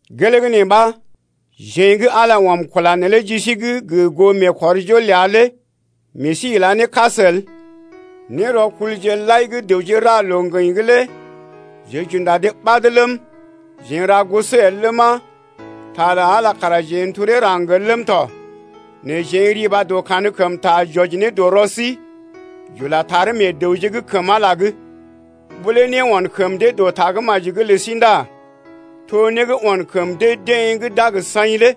Gelee gə́ neelé ɓa, jeḛ gə́ Ala ɔm kula neelé ji sí’g gə goo meekɔrjol ləa lé meḛ sí ila ne kas el. Nérɔkulje lai gə́ dəwje ra loo-ŋgəḭ lé jeḛ j’unda dee ɓad ləm, jeḛ n’ra goso el ləma, ta lə Ala kara jeḛ n’telee raŋg el ləm tɔ. Nɛ jeḛ n’riba dɔ kankəmta j’wɔji ne dɔ rɔ sí, j’ula taree meḛ dəwje’g kəm Ala’g. Ɓó lé né on kəm dee dɔ Tagə́maji’g lə sí ndá to né gə́ on kəm dee-deḛ gə́ d’a gə saḭ lé.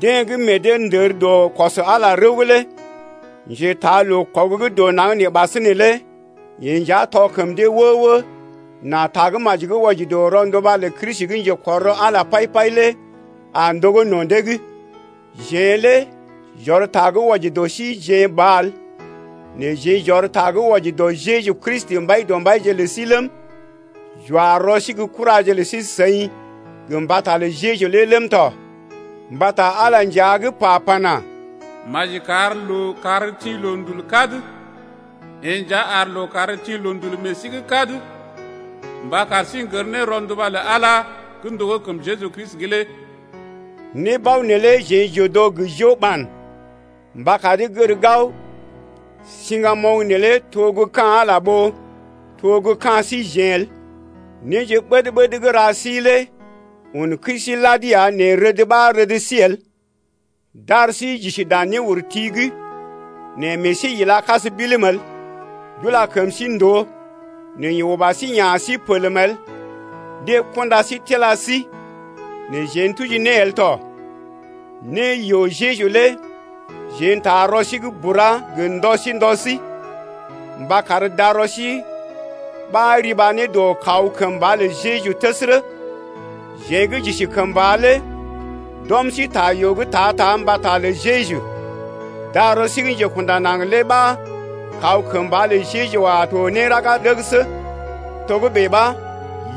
Deḛ gə́ meḛ dee ndər dɔ kɔs Ala rəw’g lé njetaa loo-kɔg gə́ dɔ naŋg nee ɓasinè lé yeḛ nja tɔ kəm dee wə-wə nà Tagə́maji gə́ wɔji dɔ rɔnduba lə Kristi gə́ njekɔr rɔ Ala pai-pai lé a ndogó no̰ dee’g. Jeḛ lé j’ɔr ta gə́ wɔji dɔ rɔ síjeḛ ba el, nɛ jeḛ j’ɔr ta gə́ wɔji dɔ Jeju Kristi, Mbaidɔmbaije lé ləm, j’wa rɔ sí gə́ kuraje lə sí-seḭ gə mbata lə Jeju lé ləm tɔ. Mbata Ala nja gə́ pa pana: Maji kar lookàr tḭ loondul kad lé yeḛ nja ar lookàr tḭ loondul meḛ sí’g kad mba kar sí n’gər ne rɔnduba lə Ala gə́ ndogó kəm Jeju Kristi’g lé. Nébao neelé jeḛ j’odo gə́ jo-ɓan mba kar dee gər gao siŋgamoŋ neelé to gə́ ka̰ Ala ɓó to gə́ ka̰ síjeḛ el. Néje ɓəd-ɓəd gə́ ra sí lé un kəi sí lad ya nɛ rəd ɓa rəd sí el, d’ar sí j’isi dan néurti’g nɛ meḛ sí ila kas bilim el, d’ula kəm sí ndòo nɛ yeḛ uba sí ya̰ sí pelm el, deḛ kunda sí tila sí nɛ jeḛ n’tuji ne el tɔ. Né yoo Jeju lé jeḛ n’taa rɔ sí’g bura gə ndɔ sí ndɔ sí mba kar darɔ sí ɓa riba ne dɔ kaw kəmba lə Jeju təsərə. Jeḛ gə́ j’isi kəmba lé d’ɔm sí ta yoo’g ta-ta mbata lə Jeju, darɔ sí gə́ njekunda naŋg lé ɓa kaw kəmba lə Jeju a to ne raga ndəgəsə. Togə́bè ɓa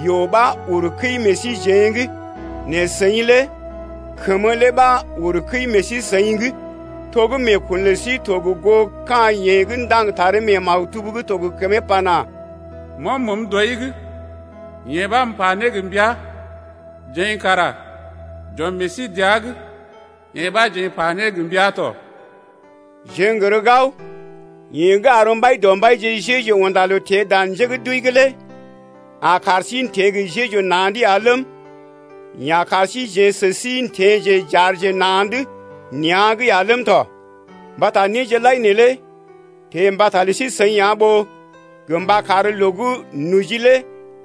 yoo ɓa uru kəi meḛ síjeḛ’g nɛ seḭ lé kəmə lé ɓa uru kəi meḛ sí-seḭ’g. To gə́ meekun lə sí to gə goo ka̰ yeḛ gə́ ndaŋg taree mee maktub gə́ to gə kəmee’g pana: M’ɔm məəm dɔi’g, yee ɓa m’pa ne gə mbəa. Jeḛ kara j’ɔm meḛ sí dəa’g, yee ɓa jeḛ m’pa ne gə mbəa tɔ. Jeḛ n’gər gao, yeḛ gə́ ar Mbaidɔmbaije Jeju unda loo teḛ dan njé gə́ d’wəi’g lé a kar sí n’teḛ gə Jeju na̰’d ya ləm, yeḛ a kar síjeḛ sə sí n’teḛje j’aarje na̰’d nea̰’g ya ləm tɔ. Mbata néje lai neelé teḛ mbata lə sí-seḭ ya ɓó gə mba kar loo gə́ noji lé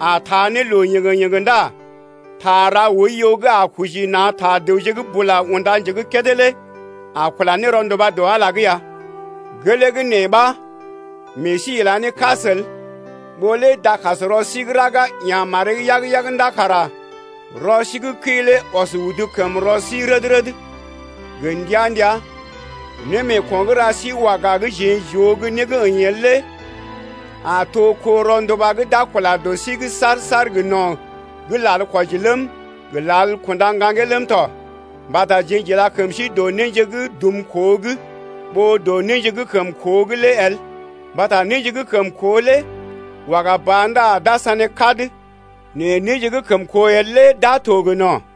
a taa ne loo yéŋgé-yéŋgé ndá ta ra oiyo gə́ a koji ne na̰ ta dəwje’g bula unda njé gə́ kédé lé a kula ne rɔnduba dɔ Ala’g ya. Gelee gə́ nee ɓa meḛ sí ila ne kas el. Ɓó lé dakasrɔ sí gə́ raga ya̰ maree yag-yag ndá kara rɔ sí gə́ kəi lé ɔs udu kəm rɔ sí’g red-red gə ndəa-ndəa. Némeeko̰ gə́ ra sí waga gə́ jeḛ j’oo gə́ né gə́ əḭ el lé a to kó rɔnduba gə́ d’a kula dɔ sí’g saar-saar gə no̰, gə́ lal kwɔji ləm, gə lal kunda ŋgaŋgee ləm tɔ. Mbata jeḛ j’ila kəm sí dɔ néje gə́ dum koo’g ɓó dɔ néje gə́ kəm koo’g lé el: mbata néje gə́ kəm koo lé waga ba ndá d’a sané kad nɛ néje gə́ kəm koo el lé d’a to gə no̰.